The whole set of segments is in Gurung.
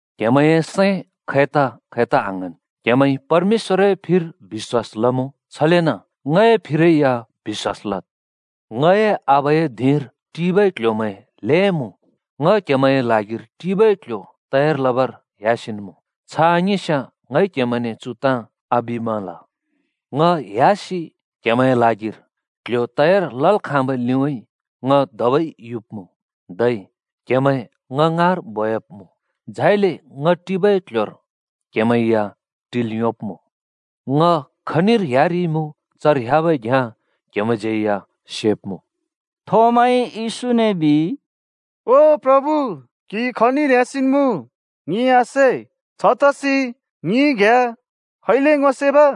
“क्‍हेमैंए सैं खैता-खैता आङ्हाँन्। क्हेमैंइ परमेश्‍वरए फिर बिश्‍वास लमुँ, छलेन ङए फिरै या बिश्‍वास लद। ङए आबाए धिंर टिबै क्‍ल्‍ह्‍योमैं ल्हें मुँ। ङ क्हेमैंए ल्हागिर टिबै क्ल्ह्‍यो तयार लबर ह्‍यासिन् मुँ। छ आङिस्याँ ङइ क्हेमैंने चु ताँ आबिमल। ङ ह्‍यासि क्हेमैंए ल्हागिर क्ल्ह्‍यो तयार लल् खाँबै ‍लिउँइँ ङ धबै युब्मुँ, धै क्हेमैं ङ ङाँर बोयाब्मुँ। झाइले ङ टिबै क्ल्ह्‍योर क्हेमैं या टिल् योंब्मुँ। ङ खनिर ह्‍यारिइमुँ, चर ह्‍याबै घ्याँ क्हेमैंज्यै या सेब्मुँ।” थोमाइ येशूने बिइ, “ओ प्रभु, क्‍हि खनिर ह्‍यासिन् मुँ ङिइ आसे, छतसि ङिइ घ्याँ खैले ङो सेब?”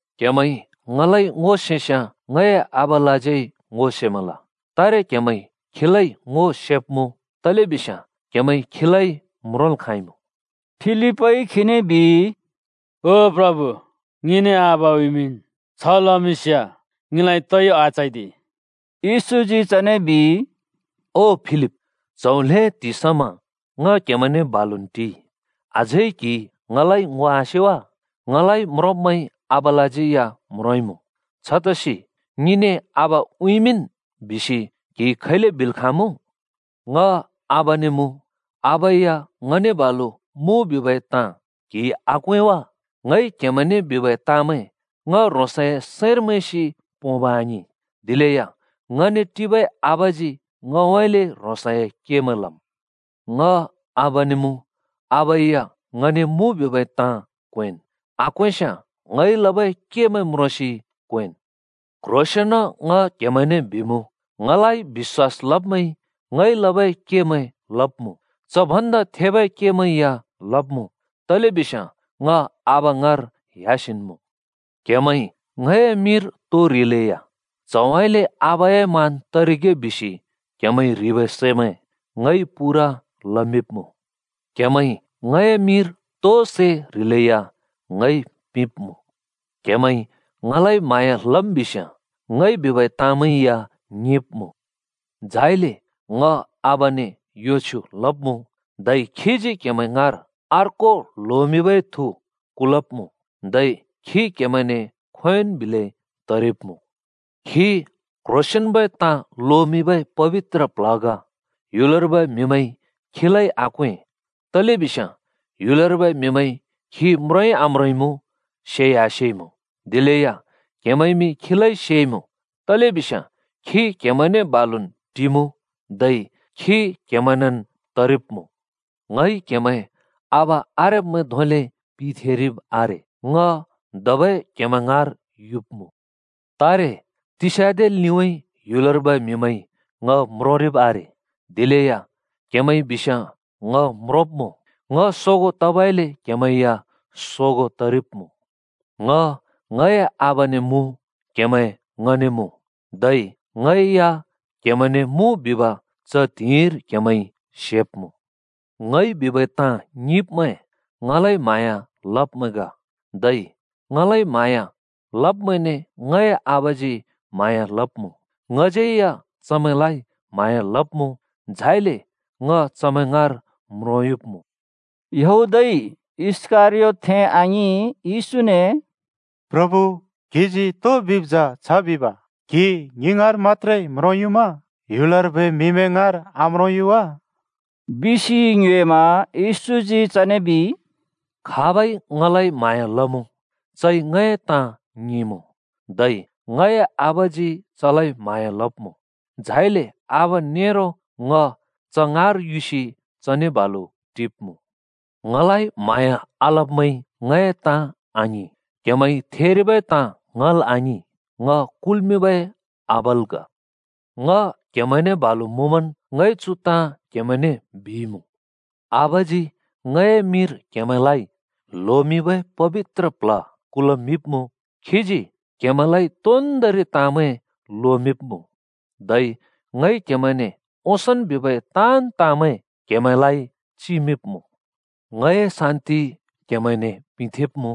क्हेमैंइ ङलाइ ङो सेस्याँ ङए आबालाज्यै ङो सेमल। तारे क्हेमैंइ खीलाइ ङो सेब्मुँ, तलेबिस्याँ क्हेमैंइ खीलाइ म्रोंल् खाँइमुँ।” फिलिपइ खीने बिइ, “ओ प्रभु, ङिने आबा उँइँमिंन्। छ लमिंस्याँ ङिलाइ तोइ आचैदि।” येशूजी चने बिइ, “ओ फिलिप! च्‍हौ ल्‍हें त्हिंइ समा ङ क्‍हेमैंने बालुन् टिइ, अझै क्हिइ ङलाइ ङो आसे वा? ङलाइ म्रोंब्मैंइ आबालाज्यै या म्रोंइँमुँ। छतसि ‘ङिने आबा उँइँमिंन्?’ बिसि क्हिइ खैले बिल् खाँमुँ? ङ आबाने मुँ, आबा या ङने बालु मुँ बिबै ताँ क्हिइ आक्वें वा? ङइ क्हेमैंने बिबै ताँमैं ङ ह्रोंसए सैंर मैंसि पोंब् आङिं। दिलेया ङने टिबै आबाजी ङउँइँले ह्रोंसए केमैं लम। ङ आबाने मुँ आबा या ङने मुँ बिबै ताँ क्वेंन्। आक्वेंस्याँ ङइ लबै केमैं म्रोंसि क्वेंन्। “क्ह्रोंसेंन ङ क्हेमैंने बिमुँ, ङलाइ बिश्‍वास लब्मैंइ ङइ लबै केमैं लब्मुँ। च भन्दा थेबै केमैं या लब्मुँ। तलेबिस्याँ ङ आबा ङाँर ह्‍यासिन् मुँ। क्हेमैंइ ङए मिंर तो ह्रिलैया च्हउँइँले आबाए मान तरिगे बिसि क्हेमैंइ ह्रिबै सैमैं ङइ पूरा लमिंब्मुँ। क्‍हेमैंइ ङए मिंर तोइ सै ह्रिलेया ङइ पिंब्मुँ। “क्‍हेमैंइ ङलाइ म्हाँया लम् बिस्याँ ङइ बिबै ताँमैं या ङिंब्‍मुँ। झाइले ङ आबाने यो छ्युँ लब्मुँ, धै खीजी क्हेमैं ङाँर अर्को ल्होमिंबै थु कुलब्मुँ। धै खी क्हेमैंने खोंयोंन् बिलै तरिब्‍मुँ। खी क्ह्रोंसेंन्बै ताँ लोमिंबै पबित्र प्ल्ह ग। ह्‍युलर्बै म्हिमैंइ खीलाइ आक्वें, तलेबिस्याँ ह्‍युलर्बै म्हिमैंइ खी म्रोंइ आम्रोंइमुँ, सेइ आसेइमुँ। दिलेया क्हेमैंमि खीलाइ सेइमुँ। तलेबिस्या खी क्हेमैंने बालुन् टिमुँ, धै खी क्हेमैंनेन् तरिब्मुँ। “ङइ क्हेमैं आबा आरेब्मैं धोंले पिथेंरिब् आरे। ङ धबै क्हेमैं ङाँर युब्मुँ। तारे तिस्‍याँदे लिउँइँ ह्‍युलर्बै म्हिमैंइ ङ म्रोंरिब् आरे। दिलेया क्हेमैंइ बिस्याँ ङ म्रोंब्मुँ। ङ सोगों तबइले क्हेमैं या सोगों तरिब्मुँ। ङ ङए आबाने मुँ, क्हेमैं ङने मुँ, धै ङै या क्हेमैंने मुँ बिब च त्हिंइर क्हेमैंइ सेब्मुँ। ङइ बिबै ताँ ङिंब्मैं ङलाइ म्हाँया लब्मैं ग। धै ङलाइ म्हाँया लब्मैंने ङए आबाजी म्हाँया लब्मुँ। ङज्यै या चमैंलाइ म्हाँया लब्मुँ, झाइले ङ चमैं ङाँर म्रोंयुब्मुँ।” यहूदइ (इस्‍करियोतथें आङिं) येशूने “प्रभु, क्हिजी तो बिब् जा छ बिब क्हि ङि ङाँर मत्‍त्रे म्रोंयुम्‍मा? ह्‍युलर्बै म्हिमैं ङाँर आम्रोंयु वा?” बिसि ङ्योएमा। येशूजी चने बिइ, “खाबइ ङलाइ म्हाँया लमुँ, चइ ङए ताँ ङिंमुँ, धै ङए आबाजी चलाइ म्‍हाँया लब्‍मुँ, झाइले आबा नेरो ङ च ङाँर युसि चने बालु टिब्‍मुँ। ङलाइ म्हाँया आलब्‍मैंइ ङए ताँ आङिं। क्हेमैंइ थेरिबै ताँ ङल् आङिं, ङ कुल्‍मिंबै आबाल् ग। “ङ क्‍हेमैंने बालु मुँमन् ङइ चु ताँ क्‍हेमैंने बिइमुँ। आबाजी ङए मिंर क्हेमैंलाइ ल्होमिंबै पबित्र प्ल्ह कुलमिंब्मुँ। खीजी क्‍हेमैंलाइ तोन्दोंरि ताँमैं लोमिंब्‍मुँ। धै ङइ क्‍हेमैंने ओंसोंन् बिबै ताँन् ताँमैं क्हेमैंलाइ चिमिंब्‍मुँ। “ङए शान्ति क्हेमैंने पिंथेंब्मुँ।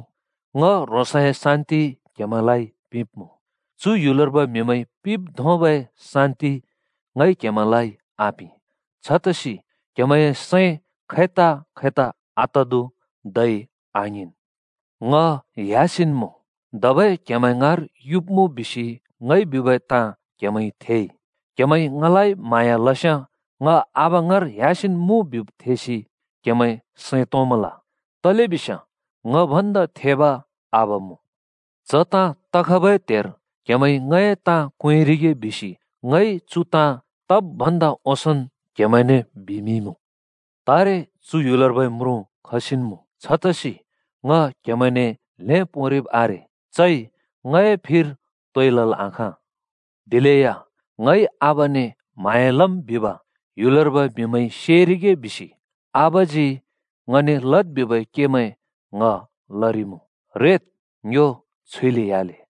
ङ ह्रोंसए शान्ति क्‍हेमैंलाइ पिंब्मुँ। चु ह्‍युलर्बै म्हिमैंइ पिंब् धोंबै शान्ति ङइ क्हेमैंलाइ आपिं। छतसि क्हेमैंए सैं खैता-खैता आतदु धै आङ्हिंन्। ‘ङ ह्‍यासिन् मुँ, धबै क्हेमैं ङाँर’ युब्मुँ बिसि ङइ बिबै ताँ क्हेमैंइ थेइ। क्हेमैंइ ङलाइ म्हाँया लस्याँ ङ आबा ङाँर ह्‍यासिन् मुँ बिब् थेसि क्हेमैं सैं तोंमल। तलेबिस्याँ ङ भन्दा थेब आबा मुँ। च ताँ तखबै त्हेर क्हेमैंइ ङए ताँ क्वेंरिगे बिसि ङइ चु ताँ तब् भन्दा ओंसोंन् क्हेमैंने बिमिंइँमुँ। तारे चु ह्‍युलर्बै म्रुँ खसिन् ‍मुँ। छतसि ङ क्‍हेमैंने ल्‍हें पोंरिब् आरे। चइ ङए फिर तोइ लल् आखाँ। दिलेया ङइ आबाने म्हाँया लम् बिब ह्‍युलर्बै म्हिमैंइ सेरिगे बिसि आबाजी ङने लद् बिबै केमैं ङ लरिमुँ। “रेद्, ङ्यो छुइले ह्‍याले।”